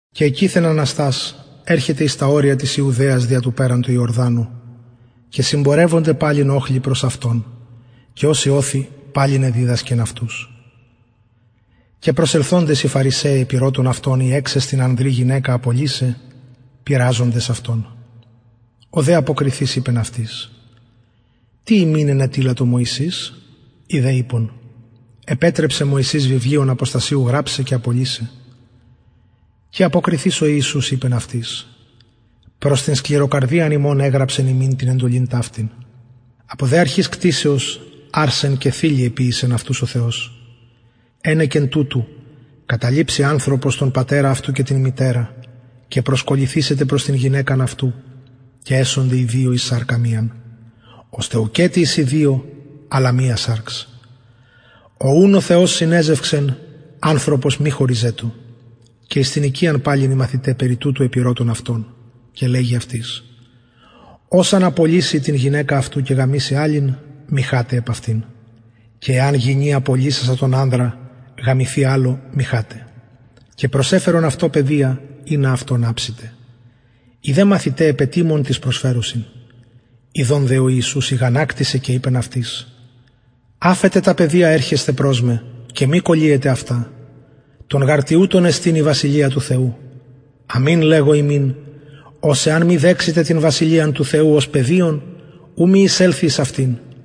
κακειθεν αναστας ερχεται εις τα ορια της ιουδαιας δια του περαν του ιορδανου και συμπορευονται παλιν οχλοι προς αυτον και ως ειωθει παλιν εδιδασκεν αυτους και προσελθοντες φαρισαιοι επηρωτησαν αυτον ει εξεστιν ανδρι γυναικα απολυσαι πειραζοντες αυτον ο δε αποκριθεις ειπεν αυτοις τι υμιν ενετειλατο μωσης οι δε ειπον μωσης επετρεψεν βιβλιον αποστασιου γραψαι και απολυσαι και αποκριθεις ο ιησους ειπεν αυτοις προς την σκληροκαρδιαν υμων εγραψεν υμιν την εντολην ταυτην απο δε αρχης κτισεως αρσεν και θηλυ εποιησεν αυτους ο θεος ενεκεν τουτου καταλειψει ανθρωπος τον πατερα αυτου και την μητερα και προσκολληθησεται προς την γυναικα αυτου και εσονται οι δυο εις σαρκα μιαν ωστε ουκετι εισιν δυο αλλα μια σαρξ ο ουν ο θεος συνεζευξεν ανθρωπος μη χωριζετω και εν τη οικια παλιν οι μαθηται αυτου περι του αυτου επηρωτησαν αυτον και λεγει αυτοις ος εαν απολυση την γυναικα αυτου και γαμηση αλλην μοιχαται επ αυτην και εαν γυνη απολυση τον ανδρα αυτης και γαμηθη αλλω μοιχαται και προσεφερον αυτω παιδια ινα αψηται αυτων οι δε μαθηται επετιμων τοις προσφερουσιν ιδων δε ο ιησους ηγανακτησεν και ειπεν αυτοις αφετε τα παιδια ερχεσθαι προς με μη κωλυετε αυτα των γαρ τοιουτων εστιν η βασιλεια του θεου αμην λεγω υμιν ος εαν μη δεξηται την βασιλειαν του θεου ως παιδιον ου μη εισελθη εις αυτην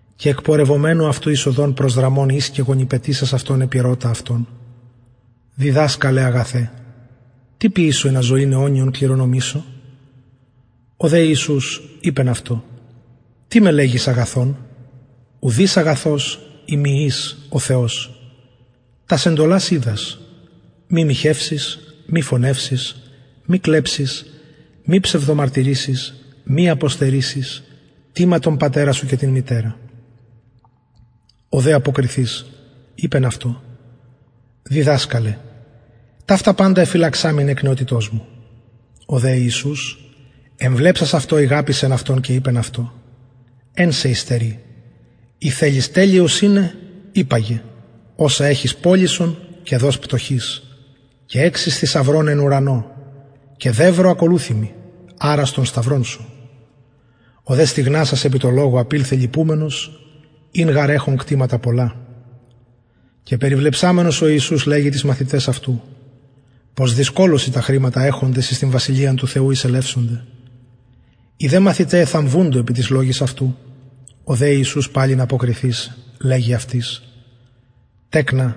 και εκπορευομενου αυτου εις οδον προσδραμων εις και γονυπετησας αυτον επηρωτα αυτον διδασκαλε αγαθε τι ποιησω ινα ζωην αιωνιον κληρονομησω ο δε ιησους ειπεν αυτω τι με λεγεις αγαθον ουδεις αγαθος ει μη εις ο θεος τας εντολας οιδας μη μοιχευσης μη φονευσης μη κλεψης μη ψευδομαρτυρησης μη αποστερησης τιμα τον πατερα σου και την μητερα ο δε αποκριθεις ειπεν αυτω διδασκαλε ταυτα παντα εφυλαξαμην εκ νεοτητος μου ο δε ιησους εμβλεψας αυτω ηγαπησεν αυτον και ειπεν αυτω εν σοι υστερει υπαγε οσα εχεις πωλησον και δος πτωχοις και εξεις θησαυρον εν ουρανω και δευρο ακολουθει μοι αρας τον σταυρον ο δε στυγνασας επι τω λογω απηλθεν λυπουμενος ην γαρ εχων κτηματα πολλα και περιβλεψαμενος ο ιησους λεγει τοις μαθηταις αυτου πως δυσκολως οι τα χρηματα εχοντες εις την βασιλειαν του θεου εισελευσονται οι δε μαθηται εθαμβουντο επι τοις λογοις αυτου ο δε ιησους παλιν αποκριθεις λεγει αυτοις τεκνα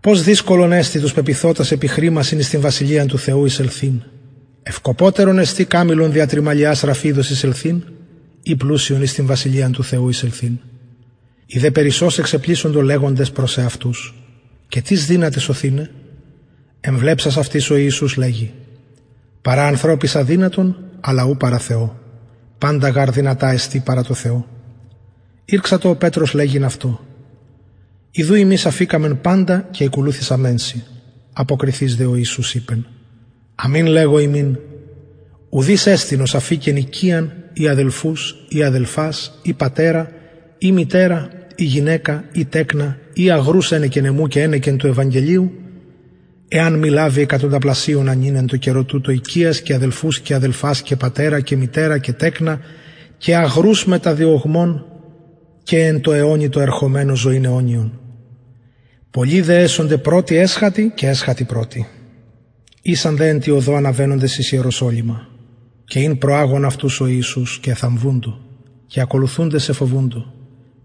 πως δυσκολον εστιν τους πεποιθοτας επι χρημασιν εις την βασιλειαν του θεου εισελθειν ευκοπωτερον εστιν καμηλον δια της τρυμαλιας της ραφιδος εισελθειν η πλουσιον εις την βασιλειαν του θεου εισελθειν οι δε περισσως εξεπλησσοντο λεγοντες προς εαυτους και τις δυναται σωθηναι εμβλεψας δε αυτοις ο ιησους λεγει παρα ανθρωποις αδυνατον αλλ ου παρα θεω παντα γαρ δυνατα εστιν παρα τω θεω ηρξατο ο πετρος λεγειν αυτω ιδου ημεις αφηκαμεν παντα και ηκολουθησαμεν σοι αποκριθεις ο ιησους ειπεν αμην λεγω υμιν ουδεις εστιν ος αφηκεν οικιαν η αδελφους η αδελφας η πατερα η μητερα η γυναικα η τεκνα η αγρους ενεκεν εμου και ενεκεν του ευαγγελιου εαν μη λαβη εκατονταπλασιονα νυν εν τω καιρω τουτω οικιας και αδελφους και αδελφας και μητερας και τεκνα και αγρους μετα διωγμων και εν τω αιωνι τω ερχομενω ζωην αιωνιον πολλοι δε εσονται πρωτοι εσχατοι και εσχατοι πρωτοι ησαν δε εν τη οδω αναβαινοντες εις ιεροσολυμα και ην προαγων αυτους ο ιησους και εθαμβουντο και ακολουθουντες εφοβουντο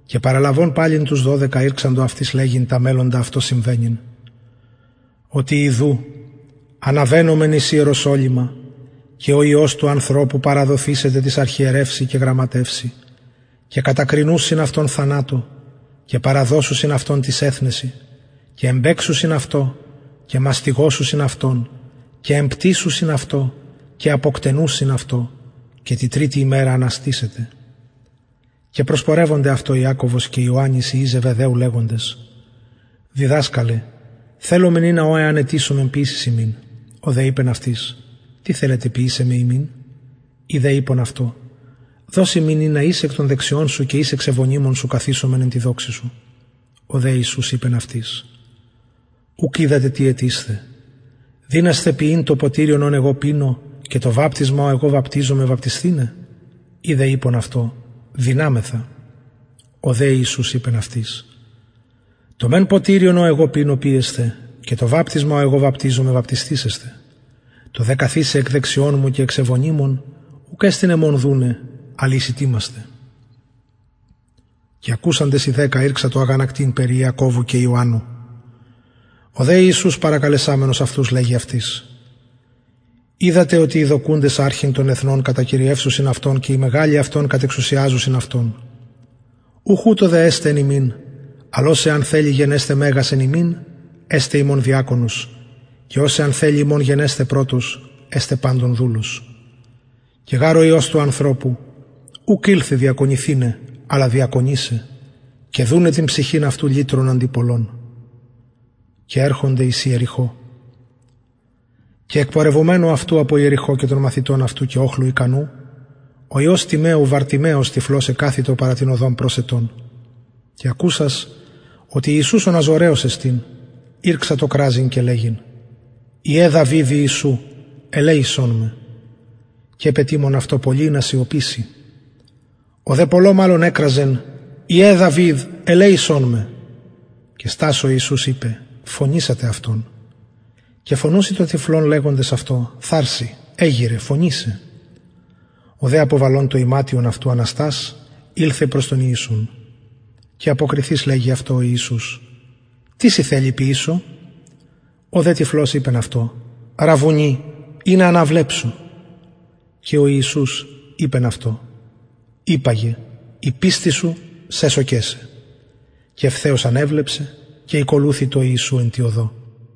και παραλαβων παλιν τους δωδεκα ηρξατο αυτοις λεγειν τα μελλοντα αυτω συμβαινειν οτι ιδου αναβαινομεν εις ιεροσολυμα και ο υιος του ανθρωπου παραδοθησεται τοις αρχιερευσιν και γραμματευσιν και κατακρινουσιν αυτον θανατω και παραδωσουσιν αυτον τοις εθνεσιν και εμπαιξουσιν αυτω και μαστιγωσουσιν αυτον και εμπτυσουσιν αυτω και αποκτενουσιν αυτον και τη τριτη ημερα αναστησεται και προσπορευονται αυτω ιακωβος και ιωαννης οι υιοι ζεβεδαιου λεγοντες διδασκαλε θελομεν ινα ο εαν αιτησωμεν ποιησης ημιν ο δε ειπεν αυτοις τι θελετε ποιησαι με υμιν οι δε ειπον αυτω δος ημιν ινα εις εκ δεξιων σου και εις εξ ευωνυμων σου καθισωμεν εν τη δοξη σου ο δε ιησους ειπεν αυτοις ουκ οιδατε τι αιτεισθε δυνασθε πιειν το ποτηριον ο εγω πινω και το βαπτισμα ο εγω βαπτιζομαι βαπτισθηναι οι δε ειπον αυτω δυναμεθα ο δε ιησους ειπεν αυτοις το μεν ποτηριον ο εγω πινω πιεσθε και το βαπτισμα ο εγω βαπτιζομαι βαπτισθησεσθε το δε καθισαι εκ δεξιων μου και εξ ευωνυμων ουκ εστιν εμον δουναι αλλ οις ητοιμασται και ακουσαντες οι δεκα ηρξαντο αγανακτειν περι ιακωβου και ιωαννου ο δε ιησους προσκαλεσαμενος αυτους λεγει αυτοις οιδατε οτι οι δοκουντες αρχειν των εθνων κατακυριευουσιν αυτων και οι μεγαλοι αυτων κατεξουσιαζουσιν αυτων ουχ ουτως δε εσται εν υμιν αλλ ος εαν θελη γενεσθαι μεγας εν υμιν εσται υμων διακονος και ος εαν θελη υμων γενεσθαι πρωτος εσται παντων δουλος και γαρ ο υιος του ανθρωπου ουκ ηλθεν διακονηθηναι αλλα διακονησαι και δουναι την ψυχην αυτου λυτρον αντι πολλων και ερχονται εις ιεριχω και εκπορευομενου αυτου απο ιεριχω και των μαθητων αυτου και οχλου ικανου υιος τιμαιου βαρτιμαιος ο τυφλος εκαθητο παρα την οδον προσαιτων και ακουσας οτι ιησους ο ναζωραιος εστιν ηρξατο κραζειν και λεγειν ο υιος δαυιδ ιησου ελεησον με και επετιμων αυτω πολλοι ινα σιωπηση ο δε πολλω μαλλον εκραζεν υιε δαυιδ ελεησον με και στας ο ιησους ειπεν αυτον φωνηθηναι και φωνουσιν τον τυφλον λεγοντες αυτω θαρσει εγειραι φωνει σε ο δε αποβαλων το ιματιον αυτου αναστας ηλθεν προς τον ιησουν και αποκριθεις λεγει αυτω ο ιησους τι θελεις ποιησω σοι ο δε τυφλος ειπεν αυτω ραββουνι ινα αναβλεψω ο δε ιησους ειπεν αυτω υπαγε η πιστις σου σεσωκεν σε και ευθεως ανεβλεψεν και ηκολουθει τω ιησου εν τη οδω